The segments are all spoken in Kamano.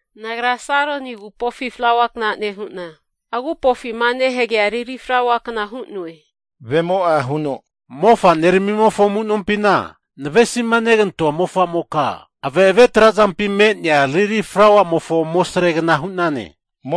Nagra Saroni agupofi flaua kna nehu'na, agupofima nehagea lili flaua kna hu'noe. Mofa'neramimofo amunompina navesima negantoa mofamoka, ave'ave trazampi me'nea lili flauamofo amosregna hu'nane.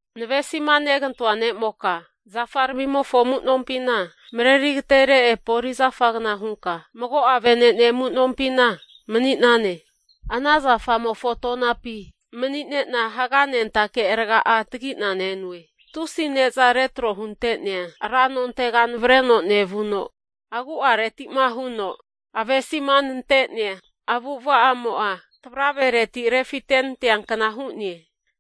Navesima negantoa ne'moka zafaramimofo amu'nompina mareri agatere epoli zafagna hunka mago'a vene'ne amu'nompina mani'nane. Ana zafamofo tonapi mani'nena haganentake raga'a tagi'na nenoe. Tusi neza retro hunte'nea ra nontega navareno nevuno, agu'areti'ma huno avesima nante'nea avu'avamo'a tavravereti refite nanteankna hu'ne.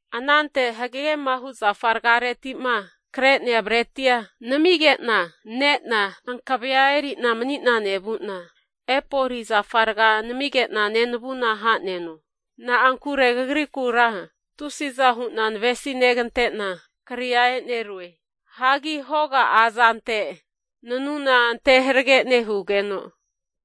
Anante hagegema hu zafargareti'ma kre'nea bretia namige'na ne'na, hankavea eri'na mani'na nevu'na, epoli zafa raga namige'na nenavuna ha'neno. Na'ankure kagrikura tusiza hu'na navesi negante'na kria e'nerue. Hagi hoga'a azante nanuna ante harage nehugeno,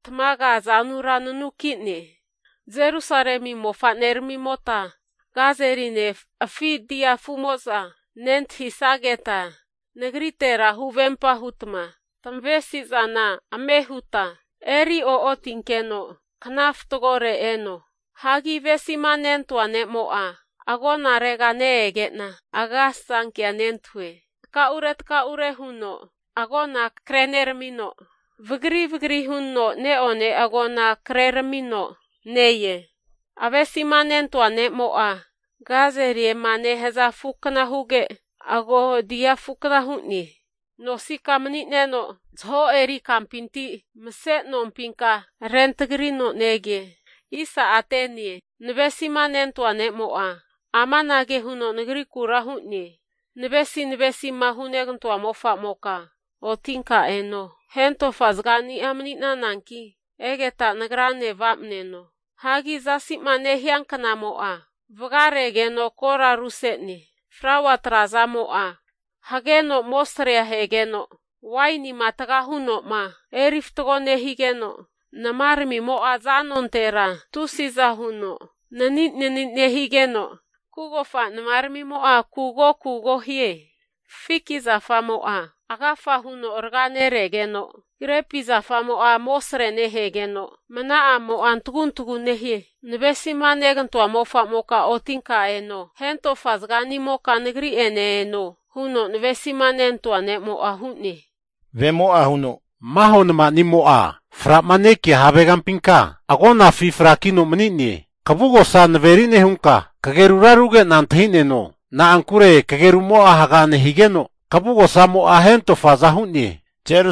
tamaga azanura nanuki'ne. Jerusalemi mofaneramimota gazeline afi dia afu'mo'za nentahisageta nagritera huvempa hutma tamavesi'zana ame huta eri o'otinkeno kna fatgore eno. Hagi avesima nentoa ne'mo'a, agonarega ne-ege'na agasasanke'a nentahue. Takaure takaure huno agona kreneramino, vagri vagri huno ne'one agona kreramino ne-e. Avesima nentoa ne'mo'a gazeliema nehaza afukna huge, agaho dia afukna hu'ne. Nosika mani'neno zaho eri kampinti mase nompinka rentragino nege. Nevesima nentoa ne'mo'a amanage huno nagrikura hu'ne, navesi navesima hunegantoa mofamoka otinka eno. Hentofa zagani'a mani'nananki egeta nagrane va'mneno. Hagi zasi'ma nehianknamo'a vagaregeno kora aruse'ne. Flaua trazamo'a hageno amosrea ahegeno, wainia taga huno eri fatgo nehigeno, namaramimo'a zanontera tusiza hu'za nani'nani nehazage'za, kugofa namaramimo'za kugokugo nehaze. Fiki zafamo'a agafa huno raga neregeno, grepi zafamo'a amosre nehegeno, mna'amo'a antaguntagu nehie. Navesima negantoa mofamoka otinka eno. Hentofa zaganimoka nagri'ene eno huno navesima nentoa ne'mo'a hu'ne! Maho namanimo'a fra'ma nekia havegampimka agonafi frakino mani'ne. Kavugosa naveri nehunka, kagerura aruge'na antahi'neno. Na'ankure kagerumo'a haga nehigeno, kavugosamo'a hentofaza hu'ne.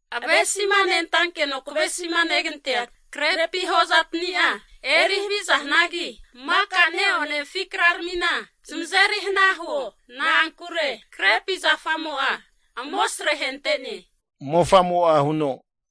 Avesima nentankeno kavesima negantea grepi hozatani'a eri haviza hanagi, maka neone afi kraramina zamazeri hana huo. Na'ankure grepi zafamo'a amosre ahente'ne.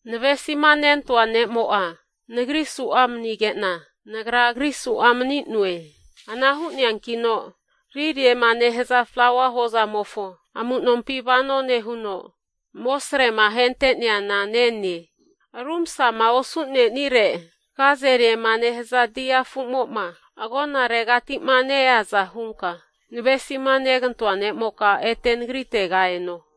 Navesima nentoa ne'mo'a nagri su'a manige'na, nagra agri su'a mani'noe. Ana hu'neankino liliema nehaza flaua hozamofo amu'nompi vano nehuno, amosrema ahente'neana nene. Rumasama osu'nenire gazeliema nehaza dia afumo'ma agonaregati'ma ne-eaza hunka, navesima negantoa ne'moka ete nagritega eno.